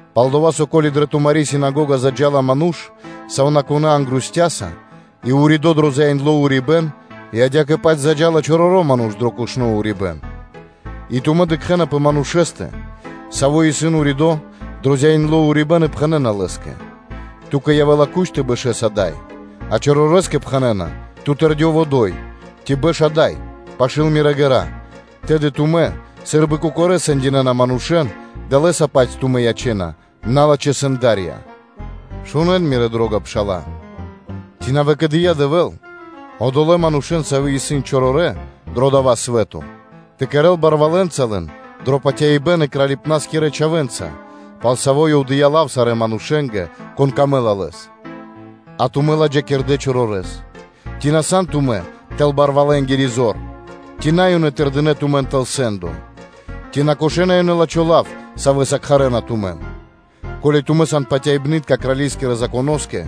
пал-дова́ со, ко́ли дрэ тумари́ синагога заджа́ла ману́ш сувнакунэ́ ангрустяса и уридо́ дро зяиндло урибэ́н, и адя́кэ-паць заджа́ла чороро́ ману́ш дро кушно урибэ́н, и тумэ́ дыкхэ́на патыва́са пэ манушэ́стэ, саво́ исын уридо́ дро зяиндло урибэ́н и пхэнэ́на лэ́скэ: “Ту́кэ явэ́ла куч тэ бэшэс ада́й, а чорорэскэ пхэнэ́на “Ту тэрдёв одо́й”, ци “Бэш ада́й пашы́л мирэ́ ґэра́”: тэды тумэ́ сы́рбы кокорэ́ сэндинэна манушэ́н, далэ́са-паць тумэ́ ячэ́на налачхэ́ сэндарьенца? Шунэ́н, мирэ́ дро́га пшала́лэ: Ци на выкэдыя́ Дэвэ́л одолэ́ манушэ́н, савэ́ исын чорорэ́ дро дава́ свэ́то тэ кэрэ́л барвалэнца лэн дро патяибэ́н и кралипнаскирэ чхавэ́нца, пал саво́ Ёв дыя́ лав сарэ́ манушэ́нгэ, конэ́скэ дро́го исын Ёв? А тумэ́ ладжакирдэ́ чорорэс. Ци на сан тумэ́ тэл барвалэнгири зор, и ци на ёнэ тырдэна тумэн тэл сэ́ндо? Ци на кошэна ёнэ лачхо́ лав, савэ́са кхарэ́на тумэн? Ко́ли тумэ́ сан патяибнытка крали́скирэ Законоскэ,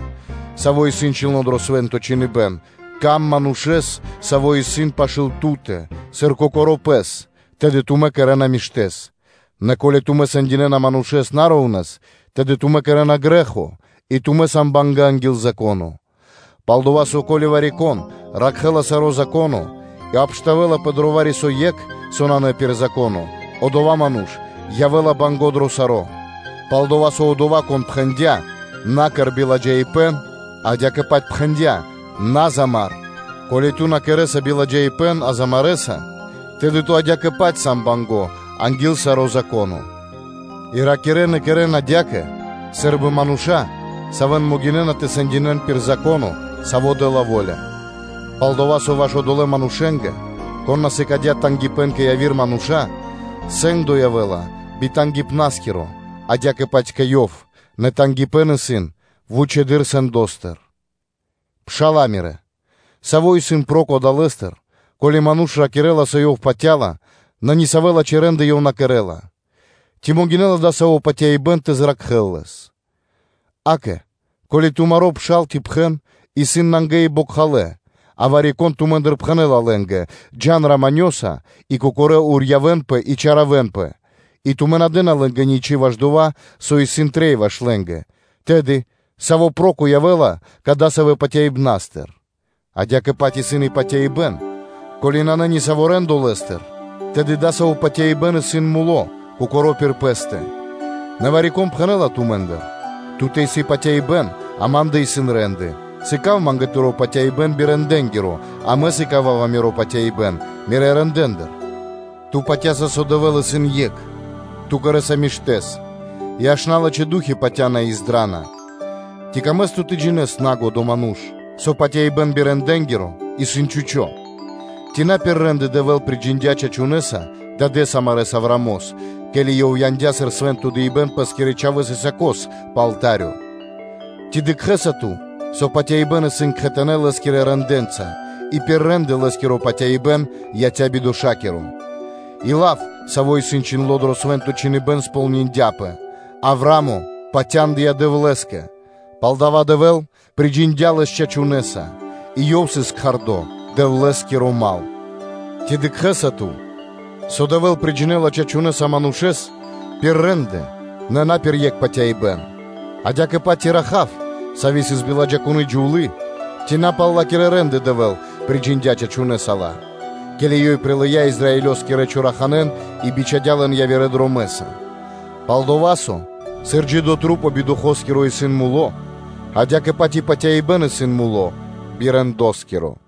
саво́ исын чхиндло́ дро Свэ́нто Чхиныбэ́н: “Рикир сыр дро́гима дро ило́ манушэ́с, саво́ исын пашы́л ту́тэ, сыр кокоро́ пэс, тэды тумэ́ кэрэ́на миштэ́с.” Нэ ко́ли тумэ́ сэндинэна манушэ́н на шэра́ (ра́внэс), тэды тумэ́ кэрэ́на грэ́хо и тумэ́ сан бангэ́ анги́л Зако́но. Пал-дова́ со, ко́ли вари-кон ракхэ́ла саро́ Зако́но и обштавэлапэ дро вари-со екх, со исын на пир Зако́но, одова́ ману́ш явэ́ла банго́ дро саро́. Пал-дова́ со Одова́, Кон пхэндя́: “На кэр биладжаипэ́н”, адя́кэ-паць пхэндя́: “На замар.” Ко́ли ту на кэрэ́са биладжаипэ́н, а замарэса, тэды ту адя́кэ-паць сан банго́ анги́л саро́ Зако́но. И ракирэ́н и кэрэ́н адя́кэ сы́рбы мануша́, савэ́н могинэ́на тэ сэндинэ́н пир Зако́но, саво́ дэ́ла во́ля; пал-дова́ со ваш одолэ́ манушэ́нгэ, кон на сыкадя́ тангипэ́н (жалима) кэ яви́р мануша́, сэ́ндо явэ́ла би тангипнаскиро адя́кэ-паць кэ ёв, нэ тангипэ́н исын вучэды́р сэндостыр. Пшала́лэ мирэ́, саво́ исын проко (льго́та) адалэстыр, ко́ли ману́ш ракирэ́ла, со ёв патя́ла, нэ ни савэ́ лачхэ́ рэ́нды ёв на кэрэ́ла? Ци могинэ́ла дасаво патяибэ́н тэ зракхэ́л лэс? Акэ, ко́ли тумаро́ пшал ци пхэн исын нангэ и бокхалэ́, а вари-кон тумэ́ндыр пхэнэ́ла лэ́нгэ: “Джа́н раманёса (миро́са) и кокорэ́ урьявэнпэ и чаравэнпэ” и тумэ́ на дэ́на лэ́нгэ ничы́ ваш дова́, со исын трэй ваш лэ́нгэ, тэды саво́ проко явэ́ла кадасавэ́ патяибнастыр? Адя́кэ-паць исын и патяибэ́н, ко́ли нанэ нисаво́ рэ́ндо лэ́стыр, тэды дасаво патяибэ́н исын муло́ кокоро́ пир пэ́стэ. Нэ вари-кон пхэнэ́ла тумэ́ндыр: “Ту́тэ исын патяибэ́н, а ма́ндэ исын рэ́нды (де́лы).” Сыка́в ма́нгэ тыро́ патяибэ́н би рэндэнгиро, а мэ сыкава́ва миро патяибэ́н мирэ́ рэндэ́ндыр. Ту патя́са, со Дэвэ́л исын екх. Ту кэрэ́са миштэ́с. И аж налачхэ́ ду́хи патя́на и издрана. Ци камэ́са ту тэ джинэ́с, нагодо ману́ш, со патяибэ́н би рэндэнгиро исын чхучо́ (пусто)? Ци на пир рэ́нды Дэвэ́л приджиндя чачунэса дадэ́с амарэс Авраамос, ке́ли ёв яндя́ сыр свэ́нто дыибэ́н пэ́скирэ чхавэ́с Исаакос пэ алта́рё? Ци дыкхэ́са ту, со патяибэ́н исын кхэтанэ́ лэ́скирэ рэндэ́нца и пир рэ́нды лэ́скиро патяибэ́н яця́ бидошакиро. И лав, саво́ исын чхиндло́ дро Свэ́нто Чхиныбэ́н, кэрдя́пэ пхэрдэ́с (сполниндяпэ): “Авраа́мо патяндыя Дэвлэ́скэ, пал дава́ Дэвэ́л приджиндя лэс чачунэса”, и ёв сыс кхардо Дэвлэ́скиро Мал. Ци дыкхэ́са ту, со Дэвэ́л приджинэла чачунэса манушэ́с пир рэ́нды, нэ на пир екх патяибэ́н? Адя́кэ-паць и Раха́в, сави́ сыс биладжакуны джувлы́, ци на пал ла́кирэ рэ́нды Дэвэ́л приджиндя чачуняса ла, ке́ли ёй прилыя́ Израилёскирэ поддыкхибнаскирэн и бичхадя́ лэн явирэ дромэ́са. Пал-дова́ со, сыр джидэ́ маса́ би духоскиро исын мулэ́, адя́кэ-паць и патяибэ́н исын муло́ би рэндоскиро.